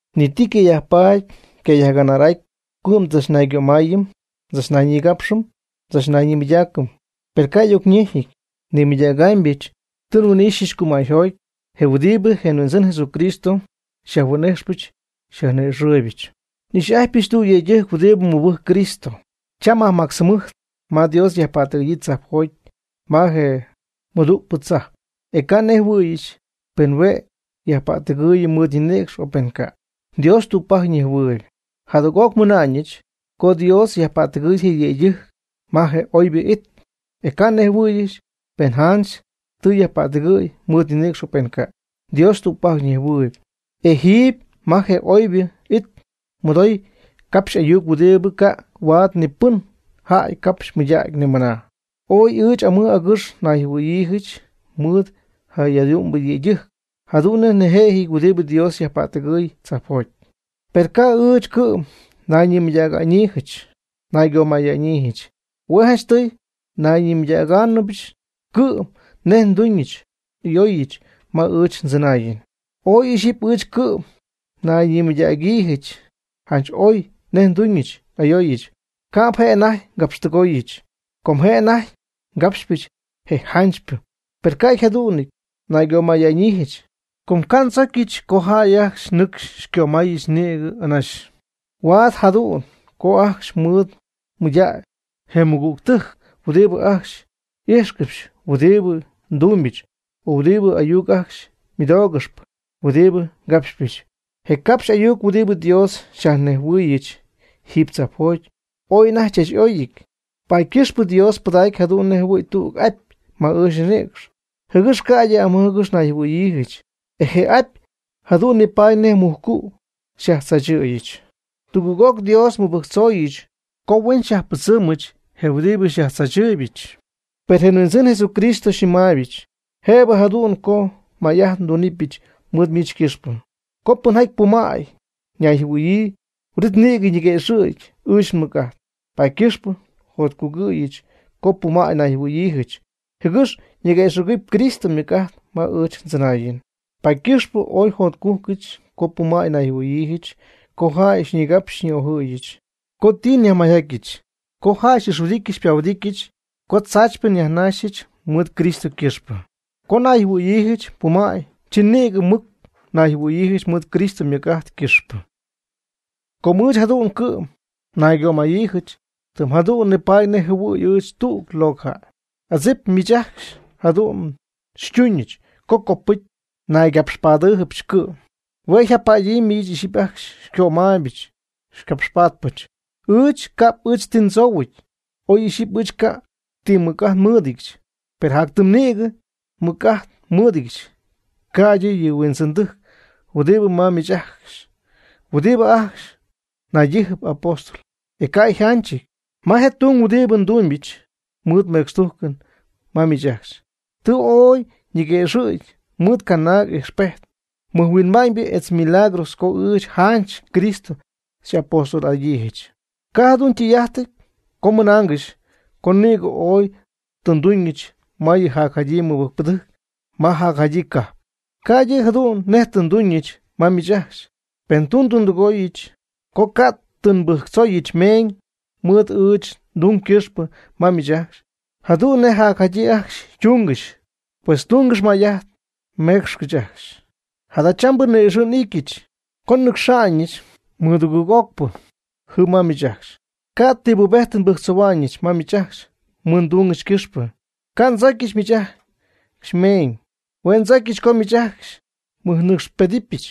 Ni ti ycayajpaady ycayajganar'aty co cɨ'm ndzachnaygömaayɨm ndzachnayñigapxɨm ndzachnayñimɨydaacɨm. Per ca' y'ocnejɨty nimɨydägaamybɨch ti nhuin'ijxypɨch cumäyjoty, je huɨdibɨ je Huindzɨn Jesucristo xyajhuin'ijxpɨch xyajni'ixɨɨybɨch. N'ixy'ajtypɨch tüg yëydɨjc huɨdibɨ mɨbɨjcp Cristo. Cham majmactz jɨmɨjt ma Dios yajpättɨgɨ̈yii tzajpjoty ma je mɨdugɨɨgpɨ tzajp. E ca' nejhuɨ̈yɨch pen hue' yajpättɨgɨɨyɨ mɨɨd ñinïcx o pen ca'. Dios tügpajc nejhuɨɨyb. Jadüg'oc nmɨna'ñɨch co Dios tɨ yajpättɨgɨy je yëydɨjc ma je oybɨ it. E ca' nnejhuɨ̈yɨch pen janch tɨ ypättɨgɨ̈y mɨɨd ñinïcx o pen ca'. Dios tügpajc nejhuɨɨyb. E jiiby ma je oybɨ it mɨdoy capxy ayuc huɨdibɨ ca' huaad ni pɨn jäy capxy mɨydägy nimɨna. Ooy ɨɨch amɨj agɨx nayjɨhuɨ̈hua'ñyiijɨch mɨɨd je jadu'mbɨ yëydɨjc jadu'n nej jëjɨn huɨdibɨ Dios yajpättɨgɨy tzajpjoty. Per ca' ɨɨch cɨ'm nayñimɨydäga'ñyiijɨch naygömaya'ñyiijɨch. Hue' janchtɨy nayñimɨydägaanɨbɨch cɨ'm nej nduñ n'ayooyɨch ma ɨɨch ndzɨnaayɨn. Oy ixyipy ɨɨch cɨ'm njanayñimɨydäga'ñyiijɨch janch oy nej nduuñ n'ayooyɨch, ca'p je' anajty ngapxtɨgooyɨch, com je' anajty ngapxpɨch je janchypɨ. Per ca' jadu'n naygömaya'ñyiijɨch, com ca' ndzocyɨch co jäy ajcxy nɨcxy xycömaayɨch nïgɨ anaxy. Huaad jadu'n co ajcxy mɨɨd mɨydacy je mɨgügtɨjc huɨdibɨ ajcxy ijxcɨxp huɨdibɨ ndumybɨch o huɨdibɨ ayuc ajcxy ymɨdoogɨxp huɨdibɨ ngapxpɨch. Je capxy ayuc huɨdibɨ Dios xyajnejhuɨɨyɨch jiiby tzajpjoty, ooy anajty chach y'oyɨty. Paady ycɨxpɨ Dios pɨdacy jadu'n nej jɨhuɨ̈y tüg apy ma ɨɨch nninïcx, jɨgɨx ca'ydɨ amɨj agɨx nayjɨhuɨ̈yiijɨch. E je apy jadu'n nipaady nej mujcu' xyajtzaachɨ̈yɨch. Tugɨɨg'oc Dios tɨ nmɨbɨjctzooyɨch co huen xyajpɨdzɨmɨch je huɨdibɨ xyajtzaachɨɨybɨch. Per je Huindzɨn Jesús xyñɨmaayɨch: “Jëbɨ jadu'n co may'ajt ndunɨpɨch mɨɨd miich ycɨxpɨ. Co pɨnjaty pumäy ñayjɨhuɨ̈yii, huin'it nïgɨ ñiguëxɨ̈gy ɨɨch nmɨc'ajt.” Paady ycɨxpɨ njotcugɨ̈yɨch co pumäy nayjɨhuɨ̈yiijɨch, jɨgɨx ñiguëxɨ̈gɨpy Cristo ymɨc'ajt ma ɨɨch ndzɨnaayɨn. Paady ycɨxpɨ ooy njotcújcɨdyɨch co pumäy nayjɨhuɨ̈yiijɨch, co jäy xyñigapxy xyñi'ojɨ̈yɨch, co ti nyajmayjatyɨch, co jäy xy'ixhuɨdityɨch xypahuɨdityɨch, co tzaachypɨ nyajnaxyɨch mɨɨd Cristo ycɨxpɨ. Co nayjɨhuɨ̈yiijɨch pumäy, chi nïgɨ mɨc nayjɨhuɨ̈yiijɨch mɨɨd Cristo ymɨc'ajt ycɨxpɨ. Co ɨɨch jadu'n cɨ'm naygapxpadyiijɨch, tɨm jadu'n nipaady nej jɨhuɨ̈y ɨɨch tüg locɨ jäy. Adzip miich ajcxy jadu'n xytuuñɨch co copɨcy naygapxpadyiijɨch cɨ'm. Hue' yjapaadyii miich ixyipy ajcxy xycömaaybɨch xycapxpatpɨch. Ɨɨch ca'p ɨɨch ti ndzoohuɨty. Oy ixyipy ɨɨch ca' ti mɨc'ajt nmɨɨdɨdyɨch, per jatytimy nïgɨ mɨc'ajt nmɨɨdɨdyɨch, ca'ydɨ yɨ huindzɨndɨjc huɨdibɨ ma miich ajcxy, huɨdibɨ ajcxy naydijɨp apóstol, e ca' yjanchɨty. Ma je tung huɨdibɨ nduuñɨch mɨɨd mecxtujcɨn ma miich ajcxy, tɨ ooy ñiguëxɨ̈gy mɨɨd canaag ijxpejt, mɨjhuinma'ñ etz milagros, co ɨɨch janch Cristo xy'apóstol'adyiijɨch. Ca' jadu'n ytɨy'ajtɨty co mmɨnaangɨxy co nïgɨ oy tɨ nduuñɨch ma yɨ jacjadyii mɨbɨjcpɨdɨjc ma jacjadyii cajp, ca'ydɨ jadu'n nej tɨ nduuñɨch ma miich ajcxy. Pen tɨ ndundɨgooyɨch co ca' tɨ nbɨjctzooyɨch meeñ mɨɨd ɨɨch ndung ycɨxpɨ ma miich ajcxy, jadu'n nej jacjadyii ajcxy ytungɨxy, pues tungɨx may'ajt meecxcɨch ajcxy. Jadachambɨ ni'ixɨ' n'ityɨch co nnɨcxa'ñɨch mɨdugɨɨg'ocpɨ jɨm ma miich ajcxy. Ca' ti pubejtɨn nbɨjctzohua'ñɨch ma miich ajcxy mɨɨd ndungɨch ycɨxpɨ. Ca' ndzocyɨch miich ajcxy mmeeñ. Hue' ndzocyɨch co miich ajcxy xymɨjnɨcxpedɨpyɨch.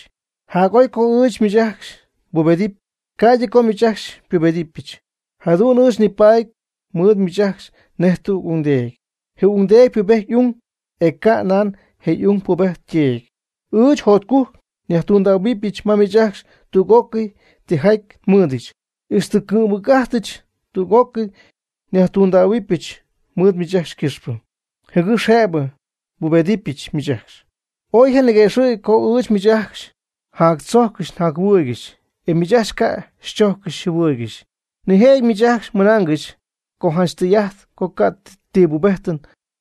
Jac'oy co ɨɨch miich ajcxy nbubedɨpy, ca'ydɨ co miich ajcxy xypubedɨpyɨch. Jadu'n ɨɨch nipaady mɨɨd miich ajcxy nej tüg ungdeedy. Je ungdeedy ypubejtpy y'ung, e ca' nan je ung pubejtyp yteedy. Ɨɨch jotcujc nyajtundähuɨbɨch ma miich ajcxy tüg'ócɨy tijaty nmɨɨdɨch, ixtɨ ngɨ'mmɨc'ajtɨch tüg'ócɨy nyajtunaamybɨch mɨɨd miich ajcxy ycɨxpɨ, jɨgɨx jëbɨ nbubedɨpyɨch miich ajcxy. Oy janiguëxɨ̈gy co ɨɨch miich ajcxy njadzojccɨxy njajɨhuɨɨygɨxy, e miich ajcxy ca' xychójccɨxyɨch xyjɨhuɨɨygɨxyɨch. Nijëjɨty miich ajcxy mmɨnaangɨxy co janch tɨy'ajt co ca' ti pubejtɨn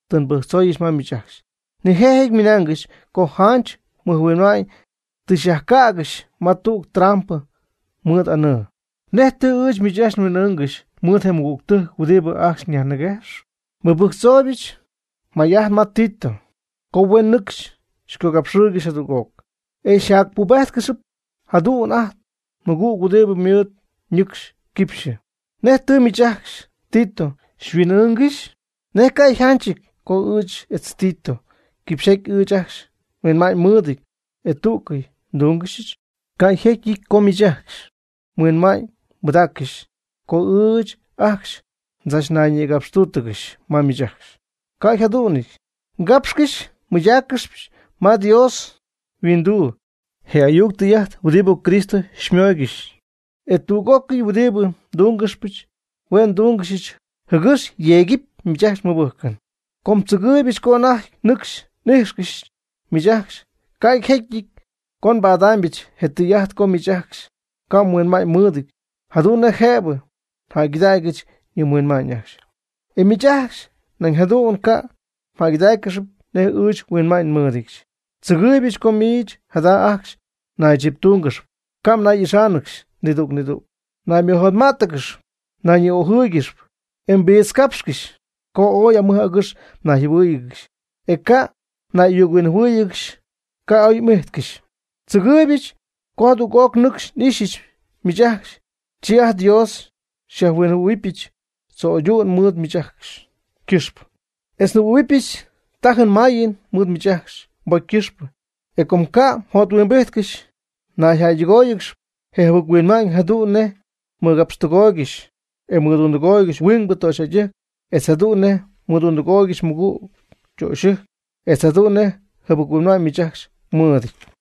tɨ nbɨjctzooyɨch ma miich ajcxy, nijëjɨty ymɨnaangɨxy co janch nihuinma'ñ tɨ nyajcägɨxyɨch ma tüg trampɨ mɨɨd anɨɨ. ¿Nej tɨ ɨɨch miich ajcxy nhuin'ɨɨngɨx mɨɨd je mɨgügtɨjc huɨdibɨ ajcxy nyajniguejx? Nbɨjctzoohuɨch may'ajt ma Tito co huen nɨcxy xycogapxɨɨygɨxy jadüg'oc. E nyajpuguexɨɨyɨch jadüg ajt nmɨgüg huɨdibɨ mɨɨd ñɨcxy quipxyɨ. ¿Nej tɨ miich ajcxy Tito xyhuin'ɨɨngɨxy? ¿Nej ca' yjanchɨty co ɨɨch etz Tito quipxyjaty ɨɨch ajcxy nhuinma'ñ nmɨɨdɨty, e tú'cɨy ndúngɨxyɨch? Ca' yjecyɨty co miich ajcxy mhuinma'ñybɨdáaccɨxy co ɨɨch ajcxy ndzachnayñigapxtúutɨgɨxy ma miich ajcxy. Ca' yjadu'nɨty. Ngápxcɨxpɨch nmɨydáaccɨxpɨch ma Dios yhuinduu je ayuc tɨy'ajt huɨdibɨ Cristo xymóoygɨxɨch. E tüg'ócɨy huɨdibɨ ndúngɨxpɨch, hue' ndúngɨxɨch jɨgɨx yeegɨp miich ajcxy mmɨbɨjcɨn. Com tzɨgɨɨybɨch co anajty nɨcxy n'íjxcɨxyɨch miich ajcxy, ca' jecyɨty co nbadaamybɨch je tɨy'ajt co miich ajcxy ca' mhuinma'ñymɨɨdɨty jadu'n nej jëbɨ njäygɨdägyɨch yɨ mhuinma'ñ ajcxy. E miich ajcxy nañ jadu'n ca' mjäygɨdáaccɨxɨpy nej ɨɨch nhuinma'ñ mɨɨdɨdyɨch. Tzɨgɨɨybɨch co miich jada' ajcxy mnaychiptúnɨgɨxy, ca' mnay'ixáanɨgɨxy nidüg nidüg, mnaymɨjotmá'tɨgɨxy; mnayñi'ojɨ́ɨyɨgɨxy, e mbiitzcapxcɨxy; co ooy amɨj agɨx mnayjɨhuɨ́ɨyɨgɨxy, e ca' mnay'ayuc-huinjɨhuɨ́ɨyɨgɨxy, ca' oy m'ijtcɨxy. Tzɨgɨɨybɨch co jadüg'oc nɨcxy n'ixyɨch miich ajcxy, chi ajt nDios xyajjɨhuɨ̈huɨbɨch tzo'ydu'n mɨɨd miich ajcxy ycɨxpɨ, etz njɨhuɨ̈huɨbɨch tajɨn mayɨn mɨɨd miich ajcxy mbocy ycɨxpɨ, e com ca'nɨ mjothuimbijtcɨxy mjäydɨgooygɨxy je mjɨbɨc-huinma'ñ jadu'n nej mmɨgapxtɨgooygɨxy e mmɨdundɨgooygɨxy huingbɨ töxyjäydɨjc, etz jadu'n nej mmɨdundɨgooygɨxy mɨgüg ytöxyɨjc, etz jadu'n nej jɨbɨc-huinma'ñ miich ajcxy mmɨɨdɨty.